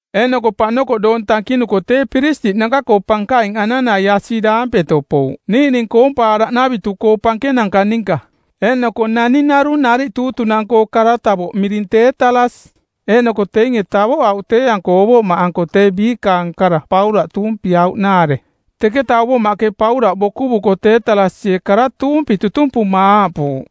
Eeꞌnoko paꞌnokoꞌ doong tankinuko tee piristiꞌnanka-koo pankaing Ananaiasi daampeto pouꞌ niiꞌning koompaaraꞌnavitu-koo pankenanka ninka eeꞌnoko naning narung nariꞌ tuutunang˜koo kara-tavoꞌ miring Teetalas. Eeꞌnoko teinge tavoꞌauꞌ tee-anko ovoꞌmaꞌanko tee biikaang kara Paulaꞌ tuumpiauꞌnaare. Teketa ovoꞌmaꞌke Paulaꞌ bokuvuko Teetalasie kara tuumpi tutumpuma aaꞌpuuꞌ,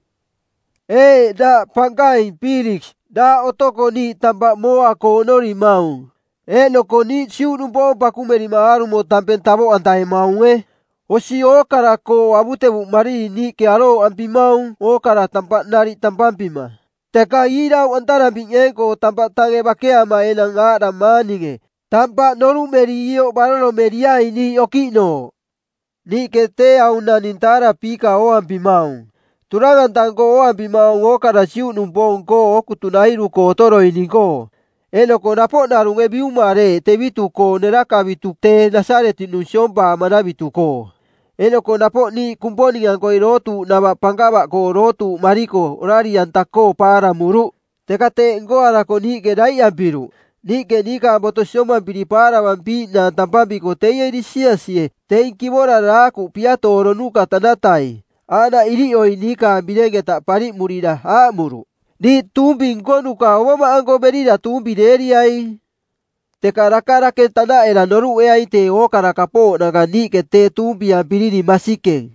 “Ee daꞌ pankaing, Piiliks, daꞌ otoko niiꞌ tampaꞌ mooa-koo oꞌnorimaung eeꞌnoko niiꞌ Juꞌnupoong pakumerima aarumo tampeng tavoꞌantavemaunge; Osi ookara-koo avutevuꞌmariri niiꞌke arooꞌampimaung ookara tampaꞌ nariꞌ tampampima. Teka iirauꞌantarampiꞌneeng-koo tampaꞌ tange bakeama enang aaꞌdamaang ninge, tampaꞌ noruꞌmeri ioꞌ baroromeriaing niiꞌ okiꞌnooꞌ. Niiꞌke tee aung naning taarapiika ooampimaung, turang-anta-nko ooampimaung ookara Juꞌnupoong-koo ookutunairu-koo otoroining-koo, eeꞌnoko napoꞌ narunge biumareeꞌ tevitu-koo nerakavitu tee Nasaretiꞌnung siompaamanavitu-koo. Eeꞌnoko napoꞌ niiꞌ Kumponing-ankoi dootuuꞌnava pankava-koo dootuuꞌmariko orari-anta-koo paaramuruꞌ, teka teeꞌ nkoarako niiꞌke daiꞌampiruꞌ; Niiꞌke niikaang boto siompampiri paaravampiiꞌnaang tampampiko teie Lisiasie, teing kivora daakuꞌ piatooronuka tanatai, aaꞌnaꞌ iriꞌoi niikaang bireng-eta pariꞌmurira aaꞌmuruꞌ, ‘Diiꞌ tuumpi nkonuka ovoꞌmaꞌanko berira tuumpireeriaing.’ Teka daka dake tanaꞌera noruꞌeaing tee ookara kapooꞌnanka niiꞌke tee tuumpiampirining masikeng.”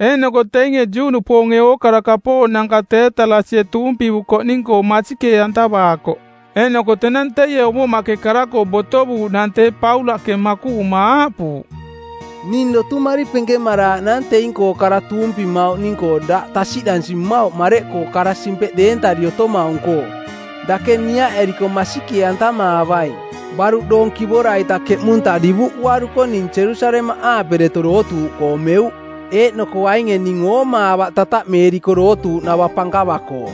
Eeꞌnoko teinge Juꞌnupoonge ookara kapooꞌnanka Teetalasie tuumpivukoꞌning-koo masikee-antavaakoꞌ. Eeꞌnoko tenang teie ovoꞌmaꞌke kara-koo botovuuꞌnang tee Paulaꞌke makuꞌuma aaꞌpuuꞌ, “Ning dotumari penkemaraaꞌnaang teing-koo kara tuumpimauꞌning-koo daꞌ tasiꞌdansi mmauꞌ mareꞌkoo daꞌ kara-simpeꞌ deentari otomaung-koo. Dake niaꞌeriko masikee-antamaavaing, baruꞌ doong kivora-ita keꞌmunta divuꞌuaruko ning Jerusalemaꞌaape deto dootuuꞌkoo meuꞌ. Eeꞌnoko ainge ning oomaavaꞌ tataꞌmeeriko dootuuꞌnava pankava-koo.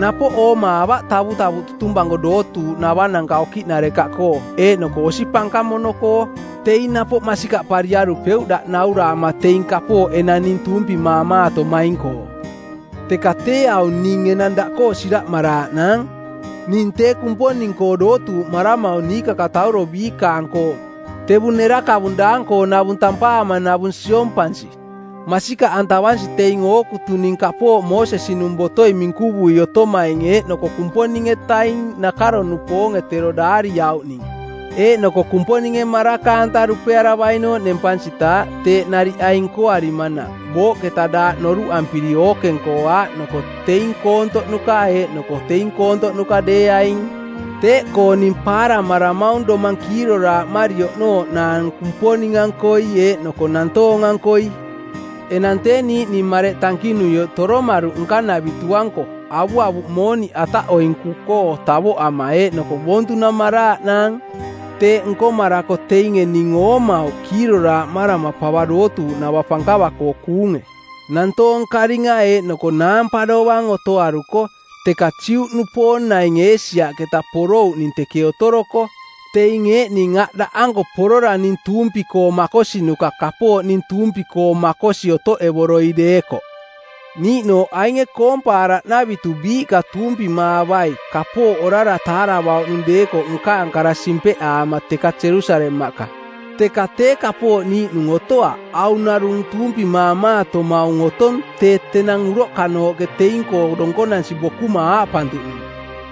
Napoꞌ oomaavaꞌ tavutavuꞌ tutumpanko dootuuꞌnavananka okiꞌnarekaꞌkoo eeꞌnoko osi pankamono-koo. Teing napoꞌ masikaꞌpariarupeuꞌ daꞌ nauraama teing kapooꞌ enang ning tuumpimaamaatomaing-koo. “Teka tee aung ning enang daꞌkoo siraꞌmaraaꞌnaang: Ning tee Kumponing-koo dootuuꞌmaramaung niikakatauro biikaang-koo tevung nerakavung daang-koonavung tampaamanavung siompansi, masikaꞌantavansi teing ookutuning kapooꞌ Moosesi-nung botoi minkuvui otomaing eeꞌnoko Kumponing-etaning nakaro-nupoonge tero daariauꞌning, eeꞌnoko Kumponinge maraka-anta dupearavainooꞌ nempansitaaꞌ teeꞌ nariꞌ aing nkoarimanaꞌ booꞌketa daaꞌ noruꞌampiri ookeng-koo aaꞌnoko teing koontoꞌnuka eeꞌnoko teing koontoꞌnuka deeaing. Teeꞌkoo ning paaramaramaung domang kiiroraaꞌmari oꞌnooꞌnaang Kumponing-ankoi eeꞌnoko nantoong-ankoi. “Enang tee niiꞌning mareꞌ tankinuioꞌ toromaruꞌ nkanavitu-anko avuavuꞌ mooniꞌ ataꞌoinkuꞌkoo tavoꞌama eeꞌnoko boontunamaraaꞌnaang. Teeꞌ nkomarako teinge ning oomauꞌ kiiroraaꞌmarama pava dootuuꞌnava pankava-koo kuunge, nantoong karinga eeꞌnoko naampa dovang otoaruko, teka Juꞌnupoong naing Eesiaꞌketa porouꞌning teke otoroko. Teing eeꞌning aꞌ daꞌanko porora ning tuumpi-koo makosinuka kapooꞌ ning tuumpi-koo makosi otoꞌevoroi deekoꞌ. Niiꞌnooꞌ ainge koompaaraꞌnavitu biiꞌka tuumpimaavai kapooꞌ orara taaravauꞌnung deekoꞌ nkaang kara simpeꞌaama teka Jerusalemaꞌka. Teka tee kapooꞌ niiꞌnung otoaꞌ, aung narung tuumpimaamaatomaung otong tee tenang uroꞌkanooꞌke teing-koo donkonansi bokuma aaꞌpantuꞌnung,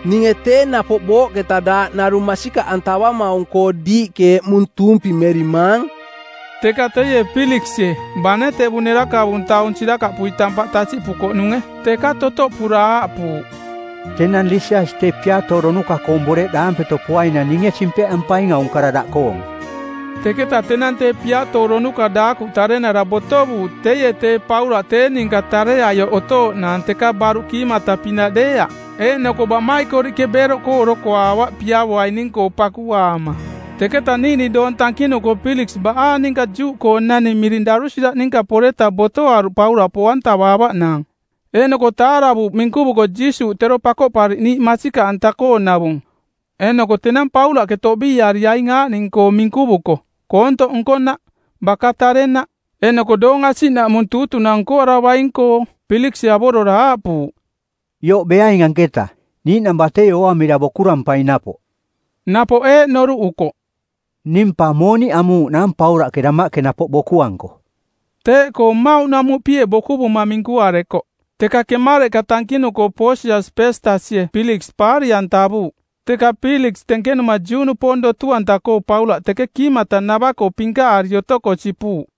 ‘Ninge tee napoꞌ booꞌketa daaꞌ narung masikaꞌantavamaung-koo diiꞌke eꞌmung tuumpimerimaang.’” Teka teie Piiliksie, bane tevung nerakavung taung sirakaꞌpui tampaꞌ tasiꞌpukoꞌnunge, teka totoꞌpura aaꞌpuuꞌ, “Tenang Lisias tee piatooronuka-koong boreꞌ daampeto poainang ninge simpeꞌampaing aung kara daꞌkoong.” Teketa tenang tee piatooronuka daakuꞌ tarenara botovuuꞌ teie tee Paulaꞌ tee ninka tareaioꞌ otooꞌnaang teka baruꞌ kiimata-pinaꞌ deeaꞌ. Eeꞌnoko baꞌmaikoriꞌke beeroꞌkoo orokoaavaꞌ piavoaining-koo pakuaama. Teketa niiꞌning doong tankinuko Piiliks baꞌaang ninka Juꞌkoonani miring Darusila ninka poreta botoaruꞌ Paulaꞌ poꞌantavaavaꞌnaang eeꞌnoko taaravuuꞌ minkuvuko Jiisuuꞌ tero Pakoꞌpariꞌniiꞌ masikaꞌanta-koonavung. Eeꞌnoko tenang Paulaꞌke toꞌbiiari aing aaꞌning-koo minkuvuko: koontoꞌ nkonaꞌ, baka tarenaꞌ, eeꞌnoko doong asiꞌnaꞌmung tuutunang nkoaravaing-koo, Piiliksie avorora aaꞌpuuꞌ, “Ioꞌ beaing anketa. Niiꞌnang batei ooamira bokurampaing napoꞌ.” Napoꞌ eeꞌ noruꞌukoꞌ, “Ning pa mooniꞌ amuuꞌnaang Paulaꞌke damaꞌke napoꞌ bokuanko.” Teeꞌkoo mmauꞌ namuꞌpie bokuvuma minkuarekoꞌ. Teka kemareꞌka tankinuko Poosias Peestasie Piiliks pariꞌantavuuꞌ, teka Piiliks tenkenuma Juꞌnupoong dotu-anta-koo Paulaꞌ teke kiimatanava-koo pinkaꞌari otoko sipuuꞌ.